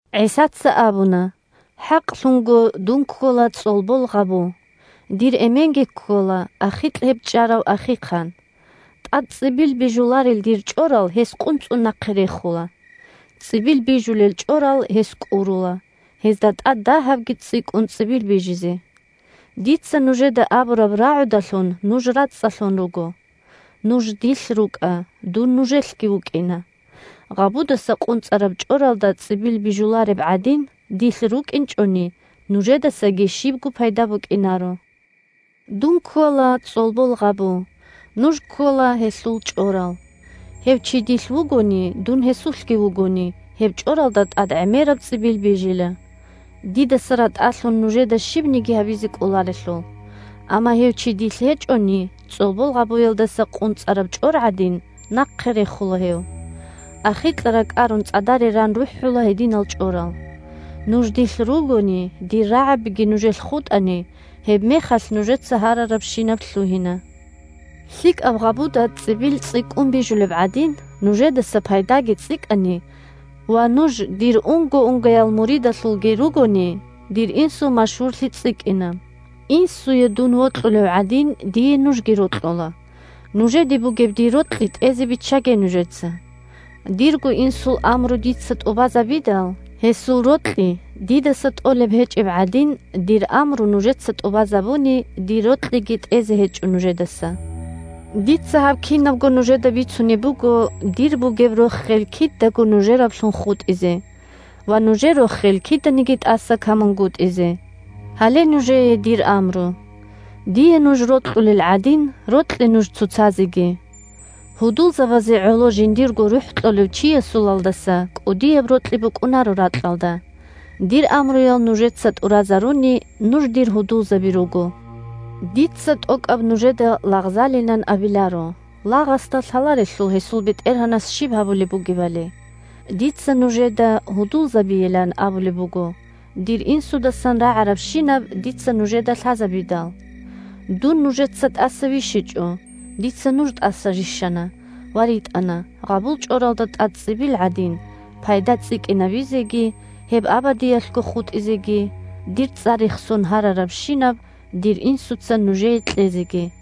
ГӀисаца абуна: – ХӀакълъунго дун ккола цӀолбол гъабу. Дир Эменги ккола ахикь гьеб чӀарав ахихъан. ТӀад цӀибил бижуларел дир чӀорал гьес къунцӀун нахъе рехула. ЦӀибил бижулел чӀорал гьес кӀурула, гьезда тӀад дагьабги цӀикӀкӀун цӀибил бижизе. Дица нужеда абураб рагӀудалъун нуж рацӀцӀалъун руго. Нуж дилъ рукӀа, дун нужелъги вукӀина. Гъабудаса къунцӀараб чӀоралда цӀибил бижулареб гӀадин, дилъ рукӀинчӀони, нужедасаги щибго пайда букӀинаро. Дун ккола цӀолбол гъабу, нуж ккола гьелъул чӀорал. Гьев чи дилъ вугони, дун гьесулъги вугони, гьеб чӀоралда тӀад гӀемераб цӀибил бижила. Дидаса ратӀалъун нужеда щибниги гьабизе кӀоларелъул. Амма гьев чи дилъ гьечӀони, цӀолбол гъабуялдаса къунцӀараб чӀор гӀадин, нахъе рехула гьев. Ахикьа ракӀарун цӀадаре ран рухӀула гьединал чӀорал. Нуж дилъ ругони, дир рагӀабиги нужелъ хутӀани, гьебмехалъ нужеца гьарарабщинаб лъугьина. ЛъикӀаб гъабуда цӀибил цӀикӀкӀун бижулеб гӀадин, нужедаса пайдаги цӀикӀкӀани ва нуж дир унго-унгоял муридаллъунги ругони, дир Инсул машгьурлъи цӀикӀкӀина. Инсуе дун вокьулев гӀадин, дие нужги рокьула. Нужеде бугеб дир рокьи тӀезе биччаге нужеца. Дирго Инсул амру дица тӀубазабидал, гьесул рокьи дидаса тӀолеб гьечӀеб гӀадин, дир амру нужеца тӀубазабуни, дир рокьиги тӀезе гьечӀо нужедаса. Дица гьаб кинабго нужеда бицунеб буго, дир бугеб рохел кидаго нужераблъун хутӀизе ва нужер рохел киданиги тӀаса камунгутӀизе. Гьале нужее дир амру: дие нуж рокьулел гӀадин, рокье нуж цоцазеги. Гьудулзабазе гӀоло жиндирго рухӀ кьолев чиясулалдаса кӀудияб рокьи букӀунаро ракьалда. Дир амруял нужеца тӀуразаруни, нуж дир гьудулзаби руго. Дица тӀокӀаб нужеда лагъзалилан абиларо, лагъасда лъаларелъул гьесул бетӀергьанас щиб гьабулеб бугебали. Дица нужеда гьудулзабийилан абулеб буго, дир Инсудасан рагӀарабщинаб дица нужеда лъазабидал. Дун нужеца тӀаса вищичӀо, дица нуж тӀаса рищана ва ритӀана, гъабул чӀоралда тӀад цӀибил гӀадин, пайда цӀикӀкӀинабизеги, гьеб абадиялъго хутӀизеги, дир цӀар рехсон гьарарабщинаб дир Инсуца нужее кьезеги.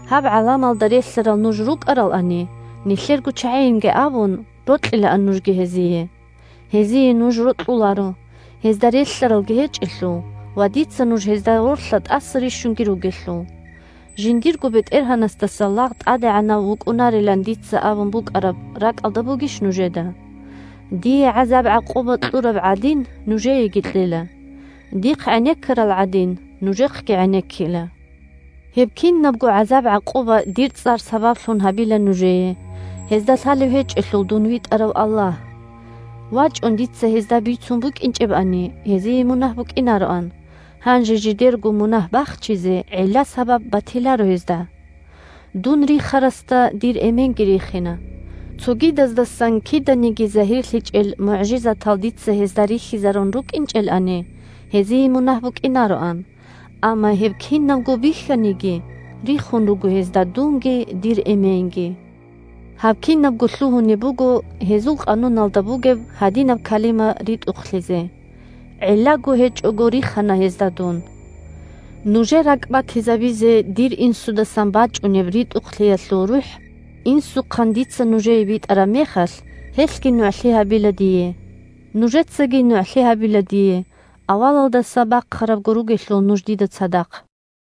Гьаб гӀаламалда релълъарал нуж рукӀаралани, нилъерго чагӀийин абун рокьилаан нужги гьезие. Гьезие нуж рокьуларо, гьезда релълъаралги гьечӀелъул ва дица нуж гьезда гъорлъа тӀаса рищунги ругелъул. Жиндирго бетӀергьанасдаса лагъ тӀадегӀанав вукӀунарилан дица абун букӀараб ракӀалда бугищ нужеда? Дие гӀазаб-гӀакъуба кьураб гӀадин, нужееги кьела. Дихъ гӀенеккарал гӀадин, нужехъги гӀенеккила. Гьеб кинабго гӀазаб-гӀакъуба дир цӀар сабаблъун гьабила нужее, гьезда лъалев гьечӀелъул дун витӀарав Аллагь. ВачӀун дица гьезда бицун букӀинчӀебани, гьезие мунагь букӀинароан, гьанже жидерго мунагь бахчизе гӀилла-сабаб батиларо гьезда. Дун рихарасда дир Эменги рихина. Цогидаздасан киданиги загьирлъичӀел мугӀжизатал дица гьезда рихьизарун рукӀинчӀелани, гьезие мунагь букӀинароан. Амма гьеб кинабго бихьаниги, рихун руго гьезда дунги дир Эменги. Гьаб кинабго лъугьунеб буго гьезул къануналда бугеб гьадинаб калима ритӀухълъизе: «ГӀиллаго гьечӀого рихана гьезда Дун». Нужер ракӀбатизабизе дир Инсудасан бачӀунеб РитӀухълъиялъул РухӀ Инсухъан дица нужее битӀараб мехалъ, гьелъги нугӀлъи гьабила дие. Нужецаги нугӀлъи гьабила дие, авалалдаса бахъарабго ругелъул нуж дида цадахъ.